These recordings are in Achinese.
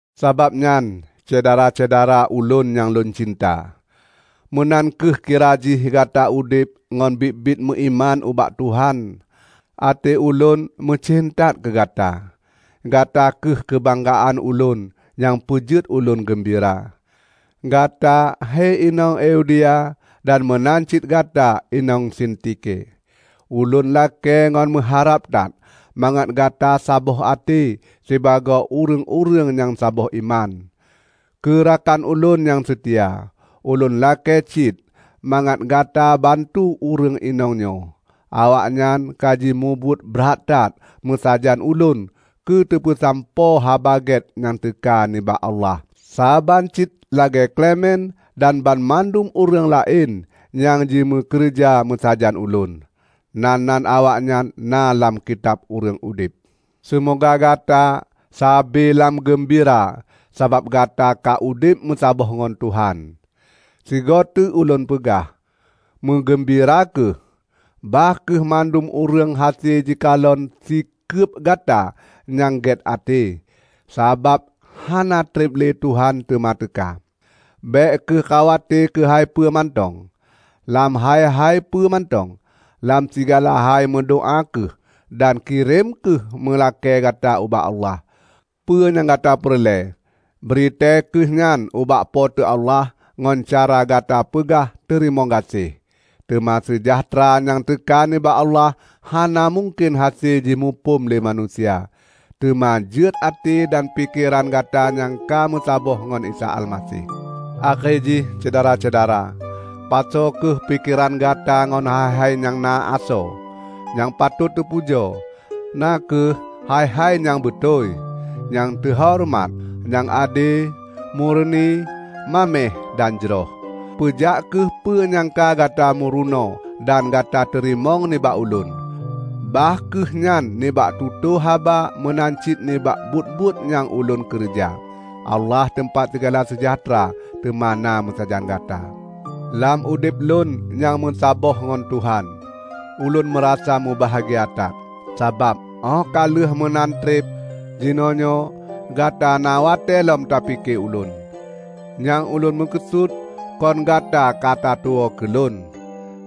Sabab nyan, Syedara-syedara ulôn nyang lôn cinta, meunan kheueh kira jih gata udeb ngon biet-biet meuiman ubak Tuhan. Até ulôn meucen that keugata! Gata kheueh keubanggaan ulôn nyang peujeuet ulôn geumbira. Gata hei inong Euodia dan meunan cit gata inong Sintike! Ulôn lakée ngon meuharab that mangat gata saboh até sibagoe ureuëng-ureuëng nyang saboh iman. Keu rakan ulôn nyang seutia, ulôn lakée cit mangat gata bantu ureuëng inong nyoe. Awaknyan ka jimubuet brat that meusajan ulôn keuteupeusampoe Haba Gét nyang teuka nibak Allah; saban cit lagée Klemen dan banmandum ureuëng laén nyang jimeukeureuja meusajan ulôn. Nan-nan awaknyan na lam Kitab Ureuëng Udeb. Seumoga gata sabe lam geumbira sabab gata ka udeb meusaboh ngon Tuhan. Sigoe teuk ulôn peugah: meugeumbira kheueh! Bah kheueh mandum ureuëng hase jikalon sikeub gata nyang gét até. Sabab hana treb lé Tuhan teuma teuka. Bék kheueh khawate keuhai peue mantong. Lam hai-hai peue mantong. Lam sigala hai meudoá kheueh dan kirém kheueh meulakée gata ubak Allah. Peue nyang gata peureulée, bri tée kheueh nyan ubak Po teu Allah ngon cara gata peugah teurimong gaséh. Teuma seujahteura nyang teuka nibak Allah hana mungken hase jimuphom lé manusia, teuma jeuet até dan pikeran gata nyang ka meusaboh ngon Isa Almaseh. Akhé jih, Syedara-syedara, pasoe kheueh pikeran gata ngon hai-hai nyang na asoe, nyang patot teupujoe, na kheueh hai-hai nyang beutôi, nyang teuhoreumat, nyang ade, mureuni, maméh, dan jroh. Peujak kheueh peue nyang ka gata meurunoe dan gata teurimong nibak ulôn; bah kheueh nyan nibak tutoe haba meunan cit nibak buet-buet nyang ulôn keureuja. Allah teumpat sigala seujahteura, teuma na meusajan gata. Lam udeb lôn nyang meusaboh ngon Tuhan, ulôn meurasa mubahgia that, sabab óh ka lheueh meunan treb, jinoenyoe gata na watée lom tapike ulôn. Nyang lôn meukeusut kon gata katatuwoe keulôn;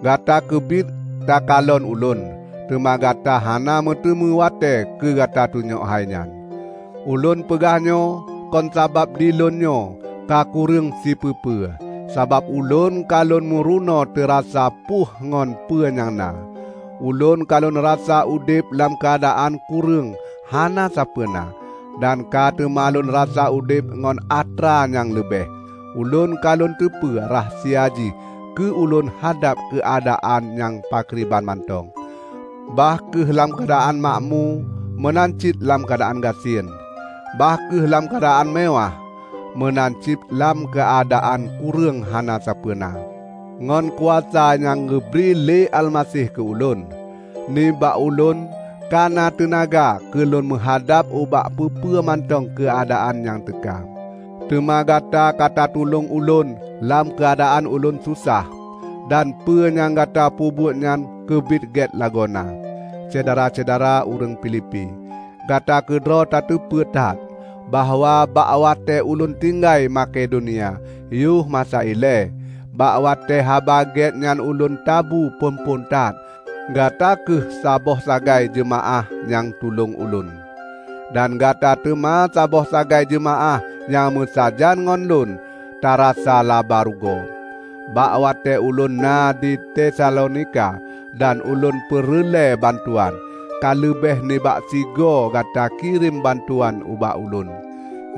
gata keubiet takalon ulôn, teuma gata hana meuteumé watée keugata tunyok hainyan. Ulôn peugah nyoe kon sabab di ulôn nyoe kakureueng sipeue-peue, sabab ulôn ka lôn meurunoe teurasa puih ngon peue nyang na. Ulôn ka lôn rasa udeb lam keuadaan kureueng hana sapeuena, dan ka teuma lôn rasa udeb ngon atra nyang leubeh. Ulôn ka lôn teupeu rahsia jih keu ulôn hadab keuadaan nyang pakriban mantong; bah kheueh lam keuadaan makmu meunan cit lam keuadaan gasien, bah kheueh lam keuadaan meuwáh meunan cit lam keuadaan kureueng hana sapeuena. Ngon kuasa nyang geubri lé Almaseh keu ulôn, nibak ulôn kana teunaga keu lôn meuhadab ubak peue-peue mantong keuadaan nyang teuka. Teuma gata katatulông ulôn lam keuadaan ulôn sosah; dan peue nyang gata peubuet nyan keubiet gét lagoena. Syedara-syedara ureuëng Filipi! Gata keudroe tateupeue that bahwa bak watée ulôn tinggai Makedonia yoh masa ilée, bak watée Haba Gét nyan ulôn tabu phon-phon that, gata kheueh saboh sagai jeumaáh nyang tulông ulôn; dan gata teuma saboh sagai jeumaáh nyang meusajan ngon lôn tarasa laba rugoe. Bak watée ulôn na di Tesalonika dan ulôn peureulée bantuan, ka leubeh nibak sigoe gata kirém bantuan ubak ulôn.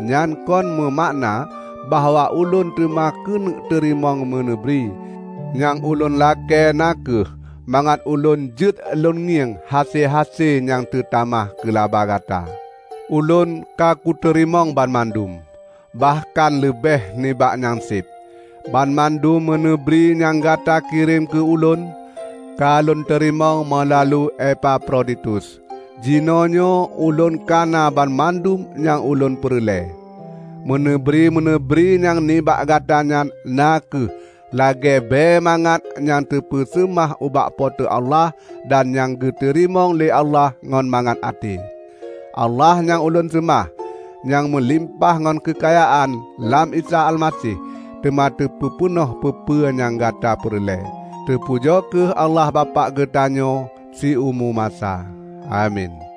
Nyan kon meumakna bahwa ulôn teuma keuneuk teurimong meuneubri. Nyang ulôn lakée na kheueh mangat ulôn jeuet lôn ngieng hase-hase nyang teutamah keulaba gata. Ulôn ka kuteurimong banmandum -- bahkan leubeh nibak nyang seb! Banmandum meuneubri nyang gata kirém keu ulôn, ka lôn teurimong meulalu Epafroditus. Jinoenyoe ulôn kana banmandum nyang ulôn peureulée. Meuneubri-meuneubri nyang nibak gata nyan na kheueh lagée bée mangat nyang teupeuseumah ubak Po teu Allah dan nyang geuteurimong lé Allah ngon mangat até. Allah nyang ulôn seumah, nyang meulimpah ngon keukayaan lam Isa Almaseh, teuma teupeupeunoh peue-peue nyang gata peureulée. Teupujoe kheueh Allah Bapak geutanyoe siumu masa! Amin.